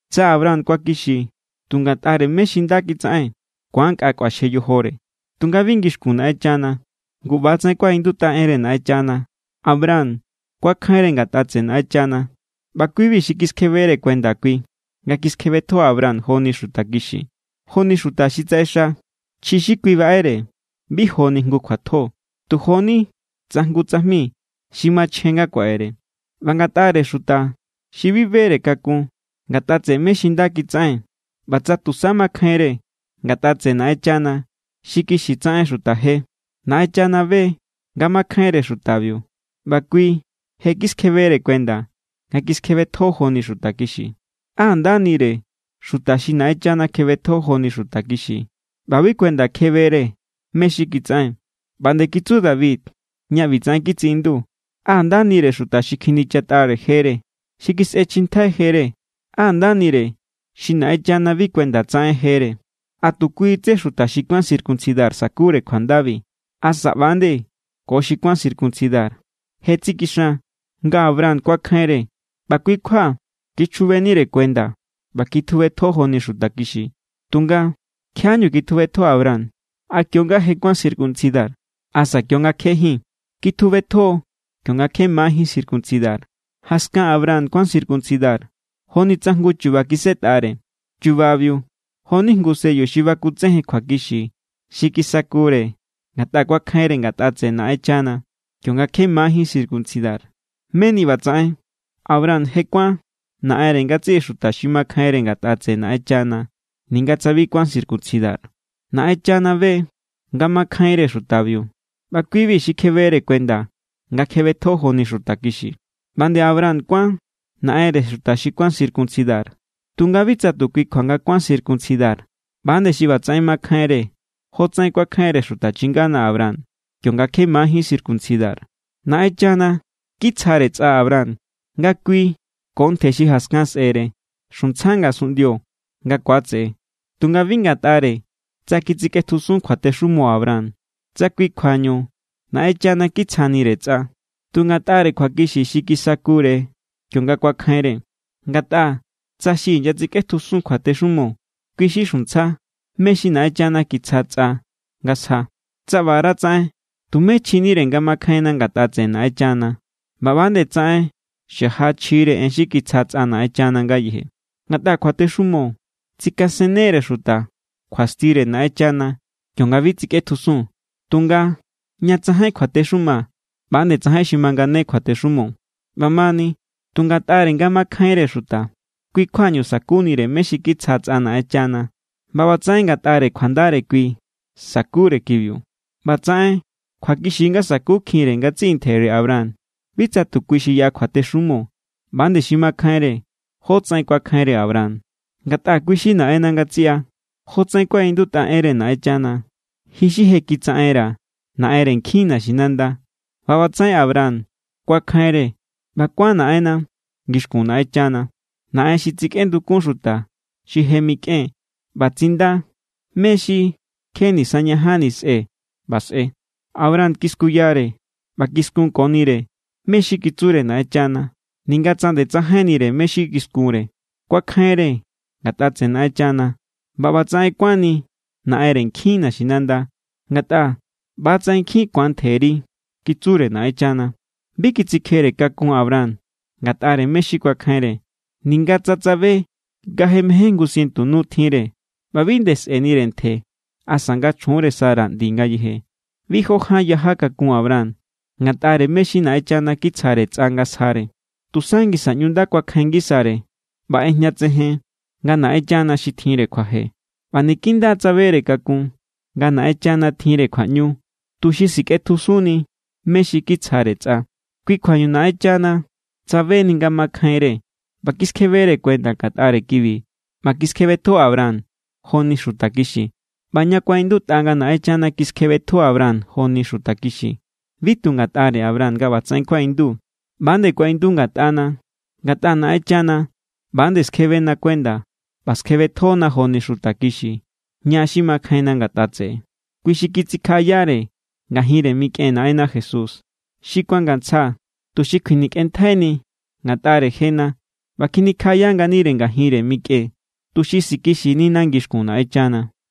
Tsa Abraham kuakixi tu ngatꞌare mé= xi nda kitsaꞌen, ku̱an nkꞌa kꞌuaxje yojore, tunga bi ngixkun Naꞌenchana. Ngu ꞌba=tsaꞌen kuaꞌindutꞌa enre Naꞌenchana: “Abraham kuakjainre ngatꞌa tseꞌe Naꞌenchana, ꞌba kui=bi xi kiskjebere kuenda kui nga kiskjebetjo Abraham joni xuta kixi.” Jo=ni xuta xi tsaꞌexa, chji xi kui baꞌere bi joni jngu kjuatjo, tu jo=ni tsa jngu tsajmi xi machjen nga kuaꞌere. ꞌBa ngatꞌare xuta xi bi bere kakun ngatꞌa tseꞌe mé= xi nda kitsaꞌen ꞌba tsa tusa makjainre ngatꞌa tseꞌe Naꞌenchana xi kixi tsaꞌen xuta je, Naꞌenchana be= nga makjainre xutabiu ꞌba kui je= kiskjebere kuenda nga kiskjebetjo joni xuta kixi. ¡Á ndanire xuta xi Naꞌenchana kjebetjo joni xuta kixi ꞌba bi kuenda kjebere mé= xi kitsaꞌen! ꞌBa nde kitsu David ñá ꞌbitsaꞌen kitsiꞌindu: ¡Á ndanire xuta xi kjinichatꞌare jere, xi kisꞌechjintjai jere! ¡Á ndanire xi Naꞌenchana bi kuenda tsaꞌen jere! ¿A tu kui tsé xuta xi kuán circuncidar sa̱kure kjuandabi? ¿Asa ꞌba=nde ko xi bi kuán circuncidar? Je tsikixan nga Abraham kuakjainre ꞌba kui= kjua kichjubenire kuenda ꞌba kitjubetjo joni xuta kixi. Tunga, ¿kjiaꞌáñu kitjubetjo Abraham? ¿A kionga je kuán circuncidar? ¿Asa kionga kjejín? Kitjubetjo= kionga kje majín circuncidar. Jaskan Abraham kuán circuncidar joni tsa jngu chu̱ba̱ kisꞌetꞌare. Chu̱ba̱biu jo=ni jngu sello xi bakutsejen kjuakixi xi kisakure ngatꞌa kuakjainre ngatꞌa tseꞌe Naꞌenchana kionga kje majín circuncidar. Meni ꞌbatsaꞌen, Abraham je kuán naꞌenre ngatsiꞌi xuta xi makjainre ngatꞌa tseꞌe Naꞌenchana ninga tsa bi kuán circuncidar. Naꞌenchana be= nga makjainre xutabiu ꞌba kui=bi xi kjebere kuenda nga kjebetjo joni xuta kixi. ꞌBa nde Abraham kuán naꞌenre xuta xi kuán circuncidar, tunga bi tsa tu kui kjua nga kuán circuncidar, ꞌba=nde xi ꞌbatsaꞌen makjainre jotsaꞌen kuakjainre xuta chingana Abraham kionga kje majín circuncidar. Naꞌenchana kitsjare tsꞌa Abraham nga kui ko ntje xi jaskan sꞌe̱re xuntsja ngasunꞌndio nga ku̱atseꞌe. Tunga bi ngatꞌare tsa kitsikꞌetjusun kjuatexumo Abraham, tsa kui kjuañu Naꞌenchana kitsjanire tsꞌa, tu ngatꞌare kjuakixi xi kisakure kionga kuakjainre. Ngatꞌa tsa xi inyatsikꞌetjusun kjuatexumo, kui= xi xuntsja mé= xi Naꞌenchana kitsja tsꞌa nga sja, tsa ꞌbaratsaꞌen tumé chjinire nga makjainna ngatꞌa tseꞌe Naꞌenchana ꞌba ꞌba=nde tsaꞌen xaja chjire en xi kitsja tsꞌa Naꞌenchana ngayeje. Ngatꞌa kjuatexumo tsikasenne=re xuta kjuastire Naꞌenchana kionga bi tsikꞌetjusun. Tunga ña tsajain kjuatexuma, ꞌba=nde tsajain xi mangane kjuatexumo. ꞌBamani tu ngatꞌare nga makjainre xuta, kui= kjuañu sa̱kunire mé= xi kitsja tsꞌa Naꞌenchana, ꞌba ꞌbatsaꞌen ngatꞌare kjuandare kui sa̱kure kibiu. ꞌBatsaꞌen kjuakixi= nga sa̱kukjinre ngatsiꞌi ntjere Abraham, bi tsa tu kui xi yaꞌa kjuatexumo, ꞌba=nde xi makjainre jótsaꞌen kuakjainre Abraham. Ngatꞌa kui= xi naꞌenna ngatsiꞌa. Jotsaꞌen kuaꞌindutꞌa enre Naꞌenchana: “Ji= xi je kitsaꞌenra̱ naꞌenre nkjin naxinanda.” ꞌBa ꞌbatsaꞌen Abraham kuakjainre ꞌba kuán naꞌenna ngixkun Naꞌenchana, Naꞌen xi tsikꞌendukun xuta xi je mikꞌen ꞌba tsinda mé= xi kje nisañajanni sꞌe ꞌba sꞌe. Abraham kiskuyare ꞌba kiskunkonire mé= xi kitsure Naꞌenchana, ninga tsa nde tsajainnire mé= xi kiskunre. Kuakjainre ngatꞌa tseꞌe Naꞌenchana ꞌba ꞌba=tsaꞌen kuánni “naꞌenre nkjin naxinanda”. Ngatꞌa: “ꞌBatsaꞌen nkjin ku̱an ntjeri”, kitsure Naꞌenchana. Bi kitsikjere kakun Abraham ngatꞌare mé= xi kuakjainre, ninga tsa tsabe nga je mején jngu sientu nure ꞌba bi nde sꞌe̱nire ntje asa nga chjunre Sara ꞌndi ngayeje. Bi jó ján yaja kakun Abraham ngatꞌare mé= xi Naꞌenchana kitsjare tsꞌa nga sjare. Tusa ngisa ꞌñu nda kuakjain ngisare ꞌba ꞌejñatsejen nga Naꞌenchana xi tjinre kjuaje. ꞌBa niki nda= tsabere kakun nga Naꞌenchana tjinre kjuaꞌñu tuxi sikꞌetjusunni mé= xi kitsjare tsꞌa. Kui= kjuañu Naꞌenchana tsabeni nga makjainre ꞌba kiskjebere kuenda ngatꞌare kibi ꞌba kiskjebetjo Abraham joni xuta kixi. ꞌBa ña kuaꞌindutꞌa nga Naꞌenchana kiskjebetjo Abraham joni xuta kixi, bi tu ngatꞌare Abraham nga ꞌbatsaꞌen kuaꞌindu. ꞌBa=nde kuaꞌindu ngatꞌana. Ngatꞌa Naꞌenchana ꞌba=nde skjebena kuenda ꞌba skjebetjona joni xuta kixi, ña xi makjainna ngatꞌa tseꞌe. Kui xi kitsikjaꞌayare ngajinre mikꞌen Naꞌenna Jesús, xi kuangantsja tuxi kjuinikꞌenntjaini ngatꞌare jena ꞌba kjinikjaꞌaya nganire ngajinre mikꞌen tuxi sikixinina ngixkun Naꞌenchana.